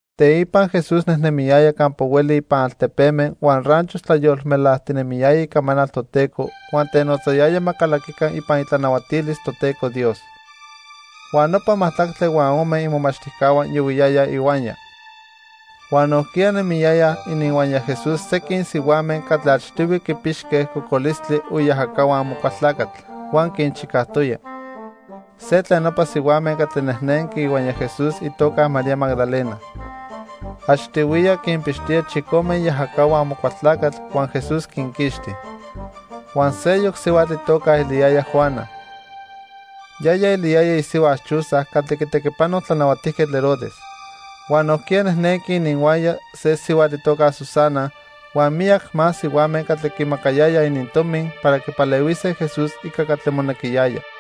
Teipa Jesús nejnemiyaya campa hueli ipan altepeme huan ranchos tlayolmelajtinemiyaya icamanal Toteco huan tenotzayaya ma calaquica ipan itlanahuatilis Toteco Dios. Huan nopa majtlacme huan ome imomachtijcahua yohuiyayaj ihuaya. Huan nojquiya nemiyayaj ininhuaya Jesús sequin sihuame catli achtihui quipixque cocolistli o iajacahua Amocualtlacatl, huan quinchicajtoya. Se tlen nopa sihuame catli nejnenqui ihuaya Jesús itoca María Magdalena. Achtihuiya quinpixtoya chicome iajacahua Amocualtlacatl huan Jesús quinquixti. Huan seyoc sihuatl itoca eliyaya Juana. Yaya eliyaya isihua Chuza catli quitequipano Tlanahuatijquetl Herodes. Huan nojquiya nejnenqui ininhuaya se sihuatl itoca Susana, huan miyac más sihuame catli quimacayayaj inintomi para quipalehuise Jesús ica catli monequiyaya.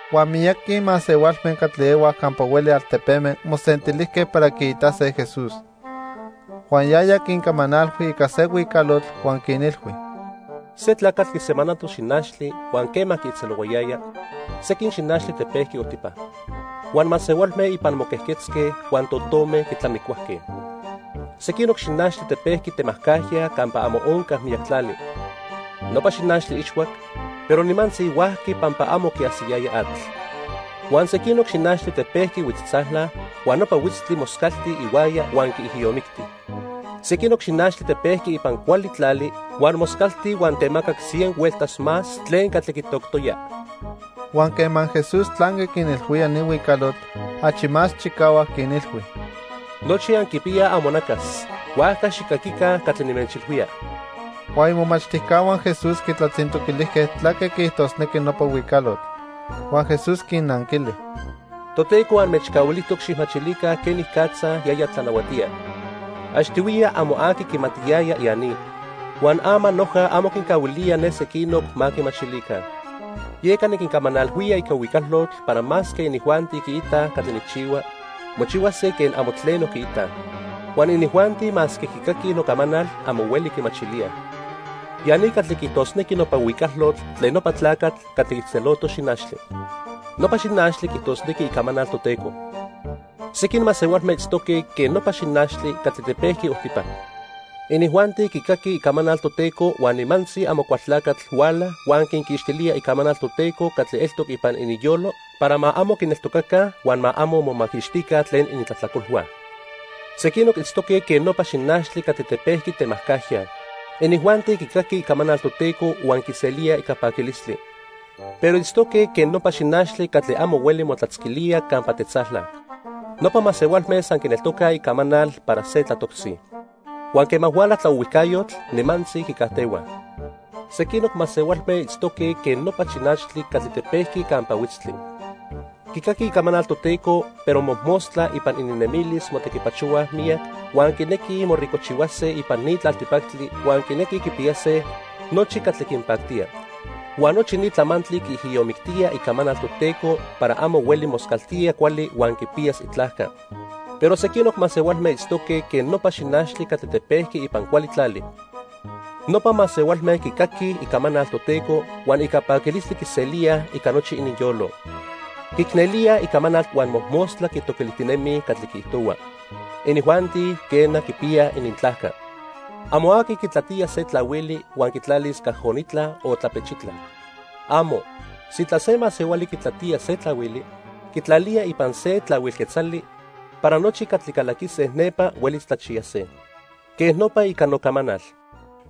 Huan miyaqui masehualme catli ehuaj campa hueli altepeme mosentilijque para quiitase Jesús. Huan yaya quincamanalhui ica se huicalotl huan quinilhui: "Se tlacatl quisemanato xinachtli huan quema quiijtzelohuayaya, sequin xinachtli tepejqui ojtipa. Huan masehualme ipan moquejquetzque, huan totome quitlamicuajque. Sequinoc xinachtli tepejqui temajcajya campa amo onca miyac tlali. Nopa xinachtli ixhuac, pero nimantzi huajqui pampa amo quiajsiyaya atl. Huan sequinoc xinachtli tepejqui huitztzala, huan nopa huitztli moscalti ihuaya huan quiijiyomicti. Sequinoc xinachtli tepejqui ipan cuali tlali huan moscalti huan temacac cien hueltas más tlen catli quitoctoya." Huan quema Jesús tlanqui quinilhuía ni huicalotl, achi más chicahuac quinilhui: —Nochi anquipiyaj amonacas, huajca xijcaquica catli nimechilhuía. Huan imomachtijcahua Jesús quitlatzintoquilijque tlaque quiijtosnequi nopa huicalotl. Huan Jesús quinnanquili: "Toteco anmechcahuilijtoc xijmachilica quenicatza yaya tlanahuatía. Achtihuiya amo aqui quimatiyaya ya ni, huan ama noja amo quincahuilía ne sequinoc ma quimachilica. Yeca niquincamanalhuía ica huicalotl para masque inijuanti quiitaj catli nijchihua, mochihuase quen amo tleno quiitaj. Huan inijuanti masque quicaquij nocamanal, amo hueli quimachilíaj. "Ya ni catli quiijtosnequi nopa huicalotl tlen nopa tlacatl catli quiijtzeloto xinachtli. Nopa xinachtli quiijtosnequi icamanal Toteco. Sequin masehualme itztoque quen nopa xinachtli catli tepejqui ojtipa. Inijuanti quicaquij icamanal Toteco huan nimantzi Amocualtlacatl huala huan quinquixtilía icamanal Toteco catli eltoc ipan ininyolo para ma amo quineltocaca huan ma amo momaquixtica tlen inintlajtlacolhua. Sequinoc itztoque quen nopa xinachtli catli tepejqui temajcajya. Inijuanti quicaquij icamanal Toteco huan quiselíaj ica paquilistli. Pero itztoque quen nopa xinachtli catli amo hueli motlatzquilía campa tetzala. Nopa masehualme san quineltocaj icamanal para se tlatoctzi. Huan quema huala tlaohuijcayotl, nimantzi quicajtehuaj. Sequinoc masehualme itztoque quen nopa xinachtli catli tepejqui campa huitztli. Quicaquij icamanal Toteco, pero mojmostla ipan ininnemilis motequipachohuaj miyac, huan quinequij moricojchihuase ipan ni tlaltipactli huan quinequij quipiyase nochi catli quinpactía. Huan nochi ni tlamantli quiijiyomictía icamanal Toteco para amo hueli moscaltía cuali huan quipiyas itlajca. Pero sequinoc masehualme itztoque quen nopa xinachtli catli tepejqui ipan cuali tlali. Nopa masehualme quicaquij icamanal Toteco huan ica paquilistli quiselíaj ica nochi ininyolo. Quiicnelíaj icamanal huan mojmostla quitoquilijtinemij catli quiijtohua. Inijuanti, quena, quipiyaj inintlajca. "Amo aqui quitlatía se tlahuili huan quitlalis cajonitla o tlapechitla. ¡Amo! Sintla se masehuali quitlatía se tlahuili, quitlalía ipan se tlahuil quetzali para nochi catli calaquise nepa huelis tlachiyase. Quej nopa ica nocamanal.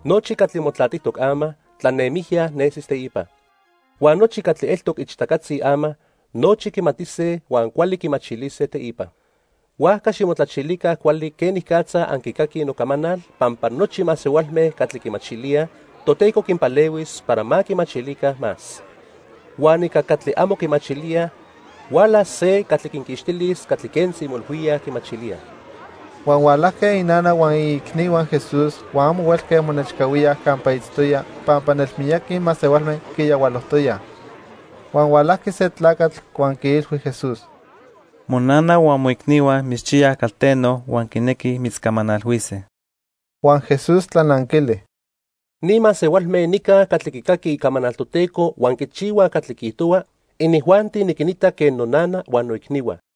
Nochi catli motlatijtoc ama, tlanemijya nesis teipa. Huan nochi catli eltoc ichtacatzi ama, nochi quimatise huan cuali quimachilise teipa. "Huajca ximotlachilica cuali quenicatza anquicaquij nocamanal, pampa nochi masehualme catli quimachilíaj, Toteco quinpalehuis para ma quimachilica más. Huan ica catli amo quimachilíaj, hualas se catli quinquixtilis catli quentzi moilhuíaj quimachilíaj." Huan hualajque inana huan iicnihua Jesús huan amo huelque monechcahuíaj campa itztoya pampa nelmiyaqui masehualme quiyahualojtoyaj. Huan hualajqui se tlacatl huan quiilhui Jesús: —Monana huan moicnihua mitzchiyaj calteno huan quinequij mitzcamanalhuise. Huan Jesús tlananquili: —Ni masehualme nica catli quicaquij icamanal Toteco huan quichihuaj catli quiijtohua, inijuanti niquinita quen nonana huan noicnihua.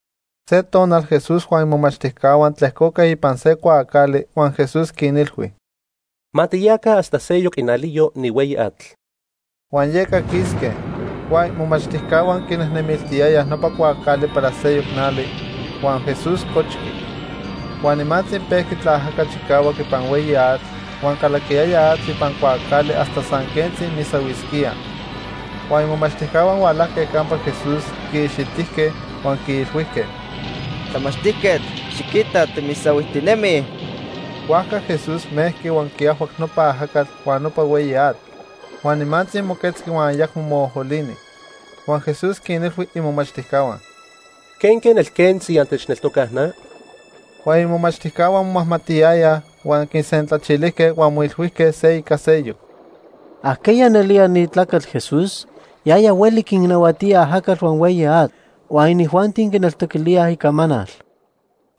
Se tonal Jesús huan imomachtijcahua tlejcoque ipan se cuaacali, huan Jesús quinilhui: —Ma tiyaca hasta seyoc inaliyo ni hueyi atl. Huan yeca quisque. Huan imomachtijcahua quinejnemiltiyayaj nopa cuaacali para seyoc nali, huan Jesús cochqui. Huan nimantzi pejqui tlaajaca chicahuac ipan hueyi atl, huan calaquiyaya atl ipan cuaacali hasta san quentzi misahuisquíaj. Huan imomachtijcahua hualajque campa Jesús, quiixitijque, huan quiilhuijque: —Tlamachtijquetl, xiquita, timisahuijtinemij. Huajca Jesús mejqui huan quiajhuac nopa ajacatl huan nopa hueyi atl. Huan nimantzi moquetzqui huan ayacmo moojolini. Huan Jesús quinilhui imomachtijcahua: —¿Quenque nelquentzi antechneltocaj na? Huan imomachtijcahua momajmatiyayaj, huan quisentlachilijque huan moilhuijque se ica seyoc: —¿Ajqueya nelía ni tlacatl Jesús? Yaya hueli quinnahuatía ajacatl huan hueyi atl, huan inijuanti quineltoquilíaj icamanal.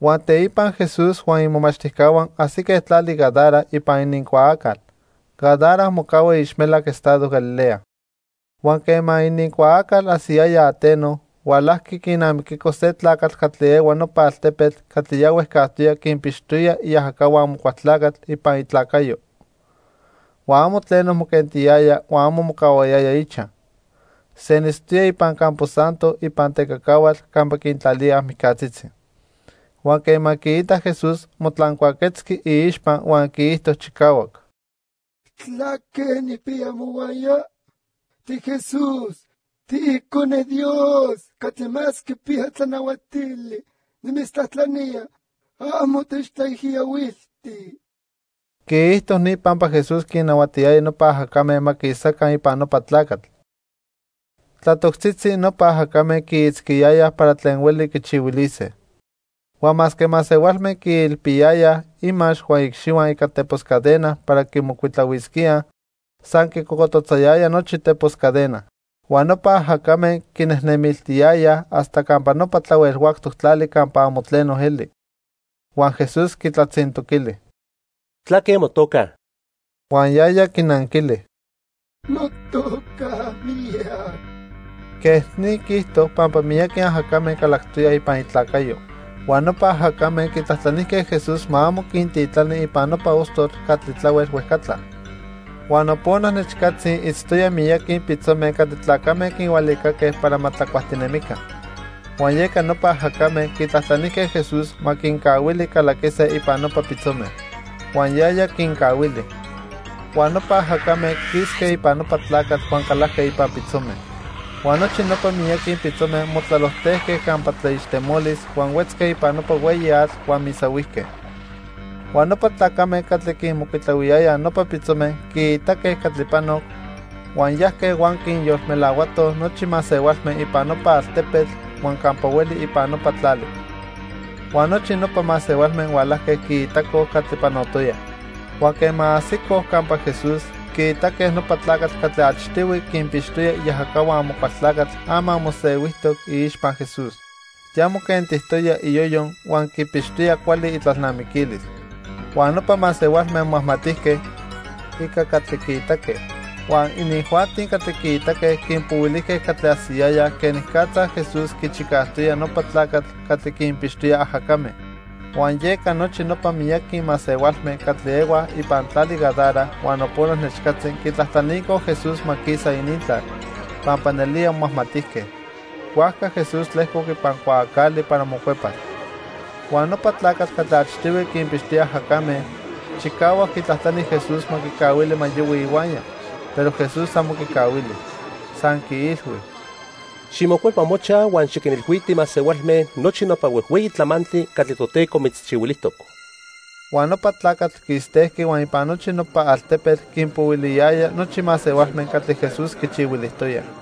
Huan teipa Jesús huan imomachtijcahua ajsique tlali Gadara ipan inincuaacal. Gadara mocahua iixmelac estado Galilea. Huan quema inincuaacal ajsiyaya ateno, hualajqui quinamiquico se tlacatl catli ehua nopa altepetl catli ya huejcajtoya quinpixtoya iajacahua Amocualtlacatl ipan itlacayo. Huan amo tleno moquentiyaya huan amo mocahuayaya ichaj. Senitztoya ipan campo santo ipan tecacahuatl campa quintlalíaj mijcatzitzi. Huan quema quiitac Jesús, motlancuaquetzqui iixpa huan quiijto chicahuac: —¿Tlaque nijpiya mohuaya? TiJesús. TiIcone Dios Catli Más Quipiya Tlanahuatili. Nimitztlajtlanía, amo techtlaijiyohuilti. Quiijto ni pampa Jesús quinnahuatiyaya nopa ajacame ma quisaca ipan nopa tlacatl. Tlatoctzitzi nopa ajacame quiitzquiyayaj para tlen hueli quichihuilise. Huan masque masehualme quiilpiyayaj imax huan iicxihua ica tepos cadena para quimocuitlahuisquíaj, san quicocototzayaya nochi tepos cadena. Huan nopa ajacame quinejnemiltiyayaj hasta campa nopa tlahuel huactoc tlali campa amo tleno eli. Huan Jesús quitlatzintoquili: —¿Tlaque motoca? Huan yaya quinanquili: —Notoca Miyac. Quej ni quiijto pampa miyaqui ajacame calactoyaj ipan itlacayo. Huan nopa ajacame quitlajtlanijque Jesús ma amo quintitlani ipan nopa ostotl catli tlahuel huejcatla. Huan nopona nechcatzi itztoyaj miyaqui pitzome catli tlacame quinhualicaque para ma tlacuajtinemica. Huan yeca nopa ajacame quitlajtlanijque Jesús ma quincahuili calaquise ipan nopa pitzome. Huan yaya quincahuili. Huan nopa ajacame quisque ipan nopa tlacatl huan calajque ipan pitzome. Huan nochi nopa miyaqui pitzome motlalojtejque campa tlaixtemolis huan huetzque ipan nopa hueyi atl huan misahuijque. Huan nopa tlacame catli quinmocuitlahuiyayaj nopa pitzome quiitaque catli panoc, huan yajque huan quinyolmelahuatoj nochi masehualme ipan nopa altepetl huan campa hueli ipan nopa tlali. Huan nochi nopa masehualme hualajque quiitacoj catli panotoya. Huan quema ajsicoj campa Jesús, quiitaque nopa tlacatl catli achtihui quinpixtoya iajacahua Amocualtlacatl ama mosehuijtoc iixpa Jesús. Ya moquentijtoya iyoyo huan quipixtoya cuali itlalnamiquilis. Huan nopa masehualme momajmatijque, ica catli quiitaque. Huan inijuanti catli quiitaque quinpohuilijque catli ajsiyayaj quenicatza Jesús quichicajtoya nopa tlacatl catli quinpixtoya ajacame. Huan yeca nochi nopa miyaqui masehualme catli ehuaj ipan tlali Gadara huan nopona nechcatzi quitlajtlanicoj Jesús ma quisa inintlal, pampa nelía momajmatijque. Huajca Jesús tlejcoc ipan cuaacali para mocuepas. Huan nopa tlacatl catli achtihui quinpixtoya ajacame, chicahuac quitlajtlani Jesús ma quicahuili ma yohui ihuaya, pero Jesús amo quicahuili. San quiilhui: —Ximocuepa mochaj huan xiquinilhuiti masehualme nochi nopa huejhueyi tlamantli catli Toteco mitzchihuilijtoc. Huan nopa tlacatl quistejqui huan ipan nochi nopa altepetl quinpohuiliyaya nochi masehualme catli Jesús quichihuilijtoya.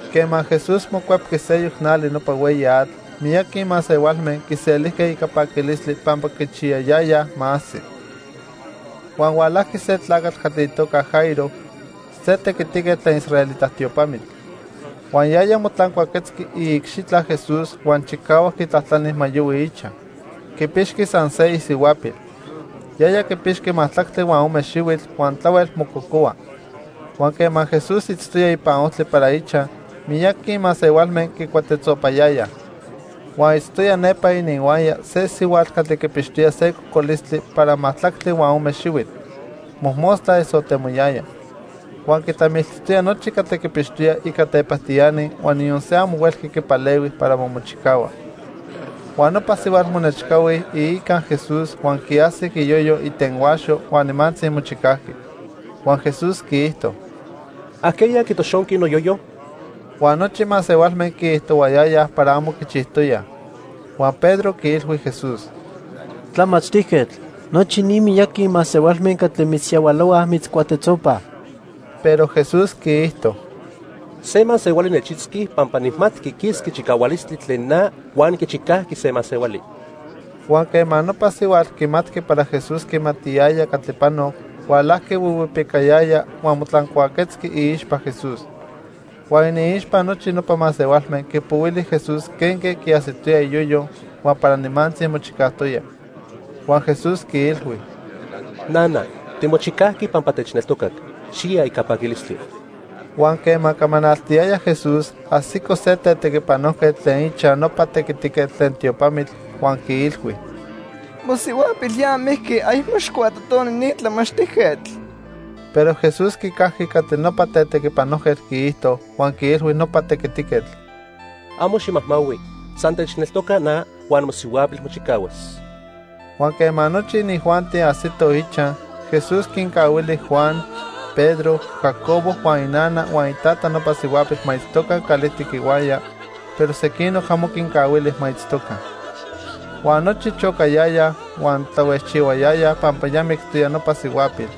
Quema Jesús mocuepqui seyoc nali nopa hueyi atl, miyaqui masehualme quiselijque ica paquilistli pampa quichiyayayaj ma ajsi. Huan hualajqui se tlacatl catli itoca Jairo, se tequitiquetl tlen israelita tiopamitl. Huan yaya motlancuaquetzqui iicxitla Jesús huan chicahuac quitlajtlani ma yohui ichaj. Quipixqui san se isihuapil. Yaya quipixqui majtlactli huan ome xihuitl huan tlahuel mococohua. Huan quema Jesús itztoya ipan ojtli para ichaj, miyaqui masehualme quicuatetzopayayaj. Huan itztoya nepa ininhuaya se sihuatl catli quipixtoya se cocolistli para majtlactli huan ome xihuitl. Mojmostla esotemoyaya. Huan quitlamiltijtoya nochi catli quipixtoya ica tepajtiani huan niyon se amo huelqui quipalehui para ma mochicahua. Huan nopa sihuatl monechcahui iica Jesús huan quiajsic iyoyo itenhuaxo huan nimantzi mochicajqui. Huan Jesús quiijto: —¿Ajqueya quitoxonqui noyoyo? Huan nochi masehualme quiijtohuayayaj para amo quichijtoyaj. Huan Pedro quiilhui Jesús: —Tlamachtijquetl, nochi ni miyaqui masehualme catli mitzyahualohuaj mitzcuatetzopaj. Pero Jesús quiijto: —Se masehuali nechitzqui pampa nijmatqui quisqui chicahualistli tlen na huan quichicajqui se masehuali. Huan quema nopa sihuatl quimatqui para Jesús quimatiyaya catli panoc, hualajqui huihuipicayaya huan motlancuaquetzqui iixpa Jesús. Huan iniixpa nochi nopa masehualme quipohuili Jesús quenque quiajsitoya iyoyo huan para nimantzi mochicajtoya. Huan Jesús quiilhui: —Nana, timochicajqui pampa techneltocac. Xiya ica paquilistli. Huan quema camanaltiyaya Jesús, ajsico se tetequipanojquetl tlen ichaj nopa tequitiquetl tlen tiopamitl, huan quiilhui: —Mosihuapil ya mijqui. Ayacmo xijcuatotoni ni tlamachtijquetl. Pero Jesús quicajqui catli nopa tetequipanojquetl quiijto huan quiilhui nopa tequitiquetl: —Amo ximajmahui, san techneltoca na huan mosihuapil mochicahuas. Huan quema nochi inijuanti ajsitoj ichaj, Jesús quincahuili Juan, Pedro, Jacobo huan inana huan itata nopa sihuapil ma itztoca calijtic ihuaya, pero sequinoc amo quincahuili ma itztoca. Huan nochi chocayayaj huan tlahuejchihuayayaj pampa ya mictoya nopa sihuapil,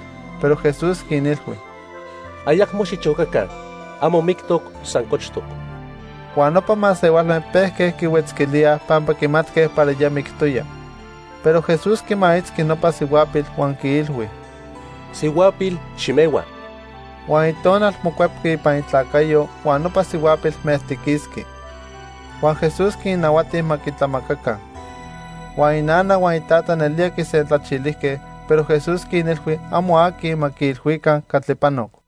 pero Jesús quinilhui: —Ayacmo xichocaca. Amo mictoc, san cochtoc. Huan nopa masehualme pejque quihuetzquilíaj pampa quimatque para ya mictoya. Pero Jesús quimaitzqui nopa sihuapil huan quiilhui: —Sihuapil, ximehua. Huan itonal mocuepqui ipan itlacayo, huan nopa sihuapil mejtiquisqui. Huan Jesús quinnahuati ma quitlamacaca. Huan inana huan itata nelía quisentlachilijque, pero Jesús quinilhui amo aqui ma quiilhuica catli panoc.